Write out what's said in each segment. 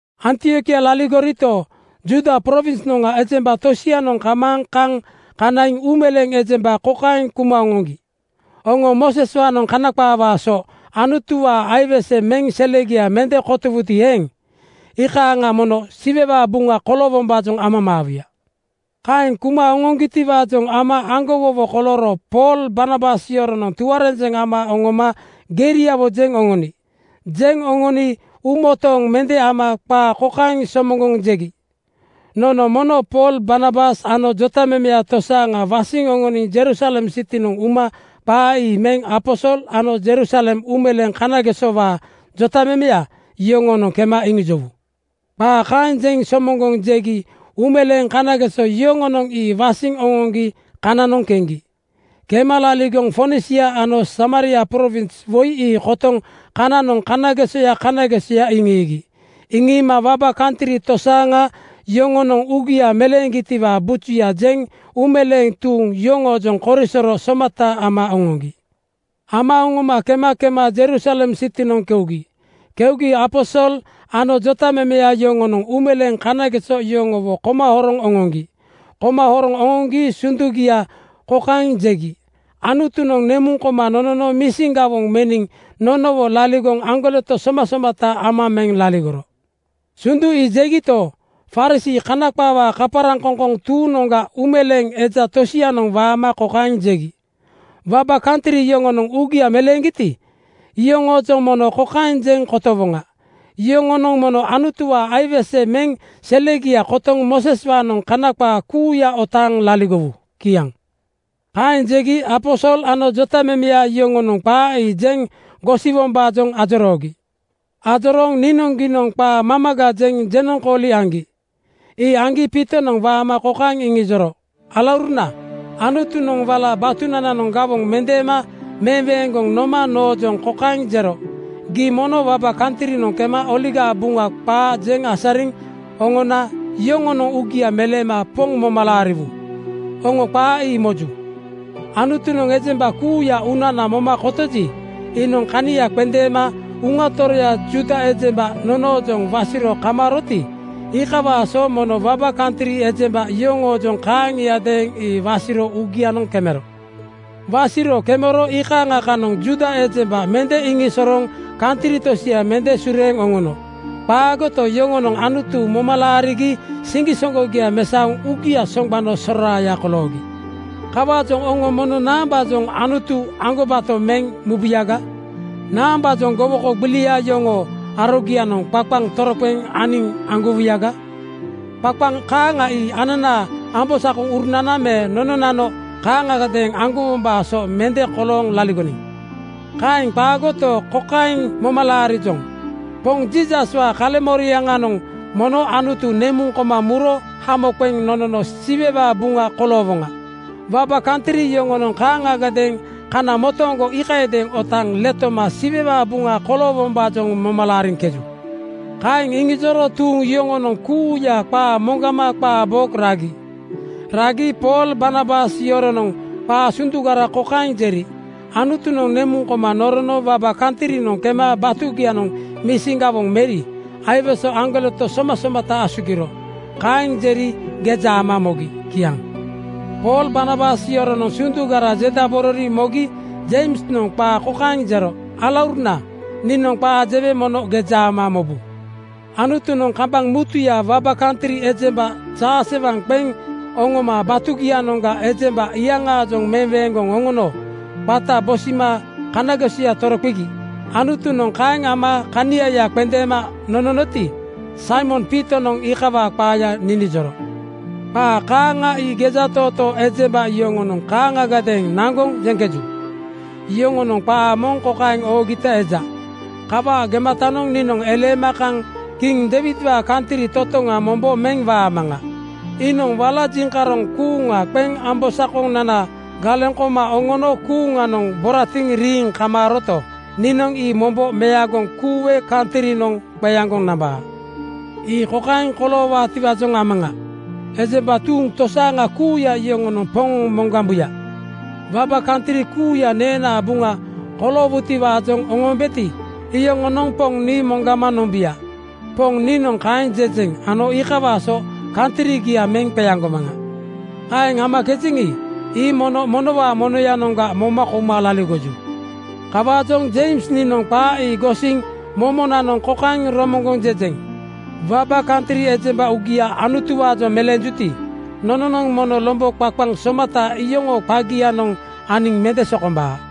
Antiokia laligorito, Judia prowinsnoŋga ejemba tosianoŋ kamaaŋ kaŋ kanaiŋ uumeleeŋ ejemba kokaeŋ kuma oŋoŋgi, “Oŋo Mooseswaanoŋ Kana qaawaa so Anutuwaa aiwese meŋ selegia mende kotowuti eeŋ, iikaaŋa mono Siwewaa buŋa koloowombaajoŋ amamaawuya.” Kaeŋ kuma oŋoŋgitiwaajoŋ ama aŋgowowo kolooro Pool Barnabas yoronoŋ tuarenjeŋ ama oŋoma geriawo jeŋ oŋoni. Jeŋ oŋoni uumotooŋ mende ama qaa kokaeŋ somoŋgoŋ jegi, “Nono mono Pool, Barnabas ano jotamemeya tosaaŋa wasiŋ oŋoniŋ Jerusalem sitinoŋ uma qaa ii meŋ aposol ano Jerusalem uumeleeŋ kanagesowaa jotamemeya yoŋoonoŋ kema iŋijowu.” Qaa kaeŋ somoŋgoŋ jegi uumeleeŋ kanageso yoŋonoŋ ii wasiŋ oŋoŋgi kananoŋ keŋgi. Kema laligoŋ Fonisia ano Samaria prowins woi ii kotoŋ kananoŋ kanagesoya kanagesoya iŋiigi. Iŋiima waba kantri tosaaŋa yoŋonoŋ uugia meleeŋgitiwaa bujuya jeŋ uumeleeŋ tuuŋ yoŋoojoŋ korisoro somata ama oŋoŋgi. Ama oŋoma kema kema Jerusalem sitinoŋ keugi. Keugi aposol ano jotamemeya yoŋonoŋ uumeleeŋ kanageso yoŋowo koma horoŋ oŋoŋgi. Koma horoŋ oŋoŋgi sundugia kokaeŋ jegi, “Anutunoŋ nemuŋ koma nonono misin gawoŋ meniŋ nonowo laligoŋ aŋgoleto somasomata ama meŋ laligoro.” Sundu ii jegito, Farisii (Kana qaawaa kaparaŋkoŋkoŋ) tuuŋnoŋga uumeleeŋ eja tosianoŋ waama kokaeŋ jegi, “Waba kantri yoŋonoŋ uugia meleeŋgiti, iyoŋoojoŋ mono kokaeŋ jeŋ kotowoŋa: Yoŋonoŋ mono Anutuwaa aiwese meŋ selegia kotoŋ Mooseswaanoŋ Kana qaa kuuya otaaŋ laligowu.” Kiaŋ. Kaeŋ jegi aposol ano jotamemeya yoŋonoŋ qaa ii jeŋ gosiwombaajoŋ ajoroogi. Ajorooŋ niinoŋgiinoŋ qaa mamaga jeŋ jenoŋkooli aŋgi. Ii aŋgi Piitonoŋ waama kokaeŋ iŋijoro, “Alauruna, Anutunoŋ wala batunananoŋ gawoŋ mendeema meweeŋgoŋ noma noojoŋ kokaeŋ jero, ‘Gii mono waba kantrinoŋ kema Oligaa Buŋa qaa jeŋ asariŋ oŋona yoŋonoŋ uugia meleema Poŋ moma laariwu.’ Oŋo qaa ii moju. Anutunoŋ ejemba kuuya uunana moma kotoji, iinoŋ kania qendeema Uŋa Toroya Juuda ejemba nonoojoŋ wasiro kamaaroti, iikawaa so mono waba kantri ejemba yoŋoojoŋ kaaŋiadeeŋ ii wasiro uugianoŋ kemero. “Wasiro kemero iikaaŋa kanoŋ Juuda ejemba mende iŋisosorooŋ kantri tosia mende sureeŋ oŋono. Qaagoto, yoŋonoŋ Anutu moma laarigi siŋgisoŋgogia mesaoŋ uugia soŋgbano soraaya koloogi. Kawaajoŋ oŋo mono naambaajoŋ Anutu aŋgobato meŋ mubuyaga? Naambaajoŋ gowoko gbilia yoŋoo arogianoŋ qaqaŋ toroqeŋ aniŋ aŋgowuyaga? Qaqaŋ kaaŋa ii ananaa ambosakonananoŋ me nononano kaaŋagadeeŋ aŋgowombaa so mende kolooŋ laligoniŋ. Kaeŋ qaagoto, kokaeŋ moma laarijoŋ: Poŋ Jiisaswaa kaleŋmoriaŋanoŋ mono Anutu nemuŋ koma muro hamo qeŋ nonono Siwewaa buŋa koloowoŋa. Waba kantri yoŋonoŋ kaaŋagadeeŋ kana motooŋgo iikayadeeŋ otaaŋ letoma Siwewaa buŋa koloowombaajoŋ moma laariŋkeju.” Kaeŋ iŋijoro tuuŋ yoŋonoŋ kuuya qaa moŋgama qaa bo ragi. Ragi Pool Barnabas yoronoŋ qaa sundugara kokaeŋ jeri, “Anutunoŋ nemuŋ koma norono waba kantrinoŋ kema batugianoŋ misin gawoŋ meri aiwese aŋgoleto somasomata asugiro.” Kaeŋ jeri geja ama mogi. Kiaŋ. Pool Barnabas yoronoŋ sundugara jedaborori mogi Jeimsnoŋ qaa kokaeŋ jero, “Alauruna, niinoŋ qaa jewe mono geja ama mobu. Anutunoŋ kambaŋ mutuya waba kantri ejemba jaasewaŋ qeŋ oŋoma batugianoŋga ejemba iyaŋaajoŋ meweeŋgoŋ oŋono qata bosima kanagesoya toroqegi. Anutunoŋ kaeŋ ama kaniaya qendeema nononoti, Saimon Piitonoŋ iikawaa qaaya ninijoro. Qaa kaaŋa ii gejatootoo ejemba yoŋonoŋ kaaŋagadeeŋ naŋgoŋ jeŋkeju. Yoŋonoŋ qaa moŋ kokaeŋ oogita eja, ‘Kawaa gematanoŋ niinoŋ eleema kaŋ kiŋ Deiwidwaa kantri totoŋa mombo meŋ waamaŋa. Iinoŋ wala jiŋkaroŋ kuuŋa qeŋ ambosakonana galeŋ koma oŋono kuuŋanoŋ boratiŋ riiŋ kamaaroto, niinoŋ ii mombo meagoŋ kuuwe kantrinoŋ qeaŋgoŋ nambaa. Ii kokaeŋ koloowaatiwaajoŋ amaŋa: Ejemba tuuŋ tosaaŋa kuuya yoŋonoŋ Poŋ moŋgambuya. Waba kantri kuuya neenaa buŋana koloowutiwaajoŋ oŋoombeti, iyoŋonoŋ Poŋ nii moŋgama nombuya. Poŋ niinoŋ kaeŋ jejeŋ ano iikawaa so kantrigia meŋ qeaŋgomaŋa. Kaeŋ amakejeŋi, ii mono monowaa monoyanoŋga moma kouma laligoju.’ “Kawaajoŋ Jeims niinoŋ qaa ii gosiŋ momonanoŋ kokaeŋ romoŋgoŋ jejeŋ: Waba kantri ejemba uugia Anutuwaanoŋ meleenjuti, nononoŋ mono lombo qaqaŋ somata iyoŋoo qagianoŋ aniŋ mende sokombaa.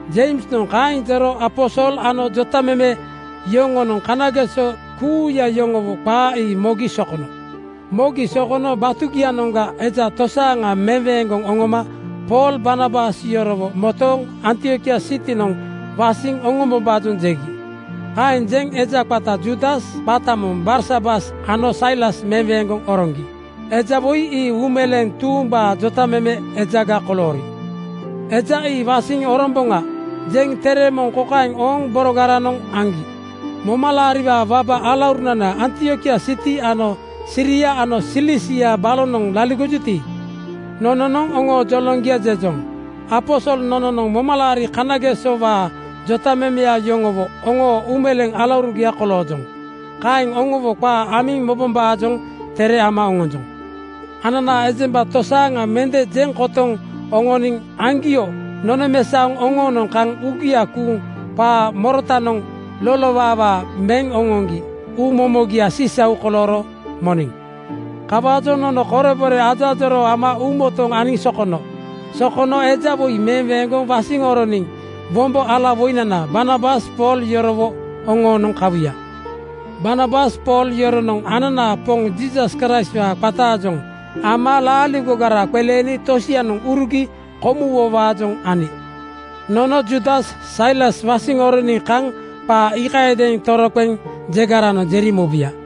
Jeimsnoŋ kaeŋ jero aposol ano jotameme yoŋonoŋ kanageso kuuya yoŋowo qaa ii mogi sokono. Mogi sokono batugianoŋga eja tosaaŋa meweeŋgoŋ oŋoma Pool Barnabas yorowo motooŋ Antiokia sitinoŋ wasiŋ oŋombombaajoŋ jegi. Kaeŋ jeŋ eja qata Juudas qata moŋ Barsabas ano Sailas meweeŋgoŋ oroŋgi. Eja woi ii uumeleeŋ tuumbaa jotameme ejaga koloori. “Eja ii wasiŋ oromboŋa,” jeŋ tere moŋ kokaeŋ ooŋ borogaranoŋ aŋgi, “Momalaariwaa waba alaurunana, Antiokia siti ano Siria ano Silisia balonoŋ laligojuti, nononoŋ oŋoo joloŋgia jejoŋ. Aposol nononoŋ momalaari kanagesowaa jotamemeya yoŋowo oŋoo uumeleeŋ alaurugiaga koloojoŋ. Kaeŋ oŋowo qaa amiŋ mobombaajoŋ tere ama oŋonjoŋ. Ananaa ejemba tosaaŋa mende jeŋ kotoŋ oŋoniŋ aŋgio nonomesaoŋ oŋoonoŋ kaŋ uugia kuuŋ qaa morotanoŋ lolowawa meŋ oŋoŋgi uu momogia sisau kolooro moniŋ. Kawaajoŋ nono korebore ajoajoroo ama uumotooŋ aniŋ sokono. Sokono eja woi meweeŋgoŋ wasiŋ oroniŋ wombo alawoinana Barnabas Pool yorowo oŋoonoŋ kawuya. Barnabas Pool yoronoŋ ananaa Poŋ Jiisas Kraistwaa qataajoŋ ama laaligogara qeleeni tosianoŋ urugi komuwowaajoŋ ani. Nono Juudas Sailas wasiŋ oroniŋ kaŋ qaa iikayadeeŋ toroqeŋ jegaranoŋ jeri mobuya.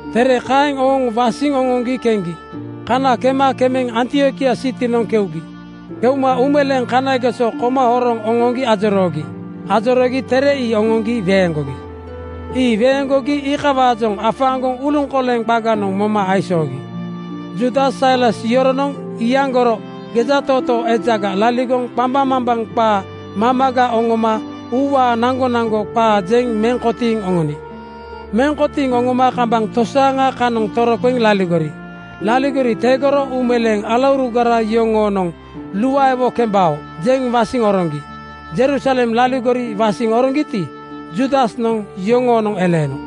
Tere kaeŋ ooŋ wasiŋ oŋoŋgi keŋgi. Kana kema kemeŋ Antiokia sitinoŋ keugi. Keuma uumeleeŋ kanageso koma horoŋ oŋoŋgi ajoroogi. Ajoroogi tere ii oŋoŋgi weeŋgogi. Ii weeŋgogi iikawaajoŋ afaaŋgoŋ uluŋkoleŋ qaganoŋ moma aisoogi. Juudas Sailas yoronoŋ iyaŋgoro gejatootoo ejaga laligoŋ qambaŋmambaŋ qaa mamaga oŋoma uuwaa naŋgonaŋgo qaa jeŋ meŋ kotiiŋ oŋoni. Meŋ kotiiŋ oŋoma kambaŋ tosaaŋa kanoŋ toroqeŋ laligori. Laligori tegoro uumeleeŋ alaurugara yoŋonoŋ “Luaewo kembao,” jeŋ wasiŋ oroŋgi. Jerusalem laligori wasiŋ oroŋgiti, Juudasnoŋ yoŋoonoŋ eleeno.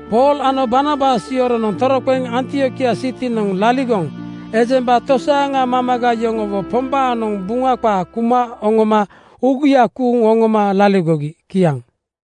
Pool ano Barnabas yoronoŋ toroqeŋ Antiokia sitinoŋ laligoŋ ejemba tosaaŋa mamaga yoŋowo Pombaanoŋ Buŋa qaa kuma oŋoma uugia kuuŋ oŋoma laligogi. Kiaŋ.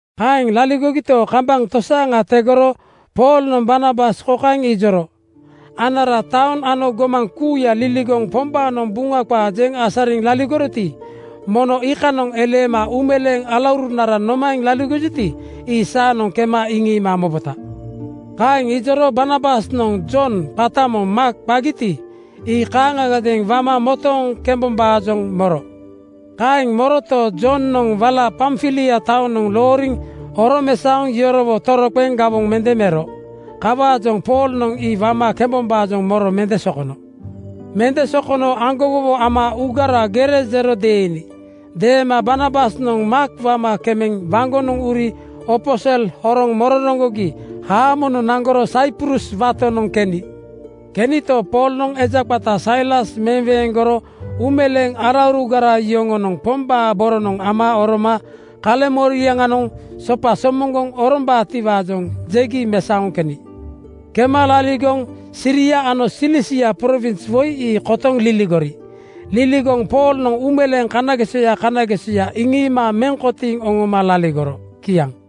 Kaeŋ laligogito, kambaŋ tosaaŋa tegoro Poolnoŋ Barnabas kokaeŋ ijoro, “Anara taoŋ ano gomaŋ kuuya liligoŋ Pombaanoŋ Buŋa qaa jeŋ asariŋ laligoriti, mono iikanoŋ eleema uumeleeŋ alaurunaranoŋ nomaeŋ laligojuti, ii saanoŋ kema iŋiima mobota.” Kaeŋ ijoro Barnabasnoŋ Jon qata moŋ Maak qagiti, ii kaaŋagadeeŋ wama motooŋ kembombaajoŋ moro. Kaeŋ moroto, Jonoŋ wala Pamfilia taonoŋ looriŋ oromesaoŋ yorowo toroqeŋ gawoŋ mende mero. Kawaajoŋ Poolnoŋ ii wama kembombaajoŋ moro mende sokono. Mende sokono aŋgowowo ama uugara gere jero deeni. Deema Barnabasnoŋ Maak wama kemeŋ waŋgonoŋ uri opo sel horoŋ mororoŋgogi haamonoŋ naŋgoro Saiprus watonoŋ keni. Kenito, Poolnoŋ eja qata Sailas meweeŋgoro uumeleeŋ alaurugara yoŋonoŋ Pombaa boronoŋ ama oroma kaleŋmoriaŋanoŋ sopa somoŋgoŋ orombaatiwaajoŋ jegi mesaoŋ keni. Kema laligoŋ Siria ano Silisia prowins woi ii kotoŋ liligori. Liligoŋ Poolnoŋ uumeleeŋ kanagesoya kanagesoya iŋiima meŋ kotiiŋ oŋoma laligoro. Kiaŋ.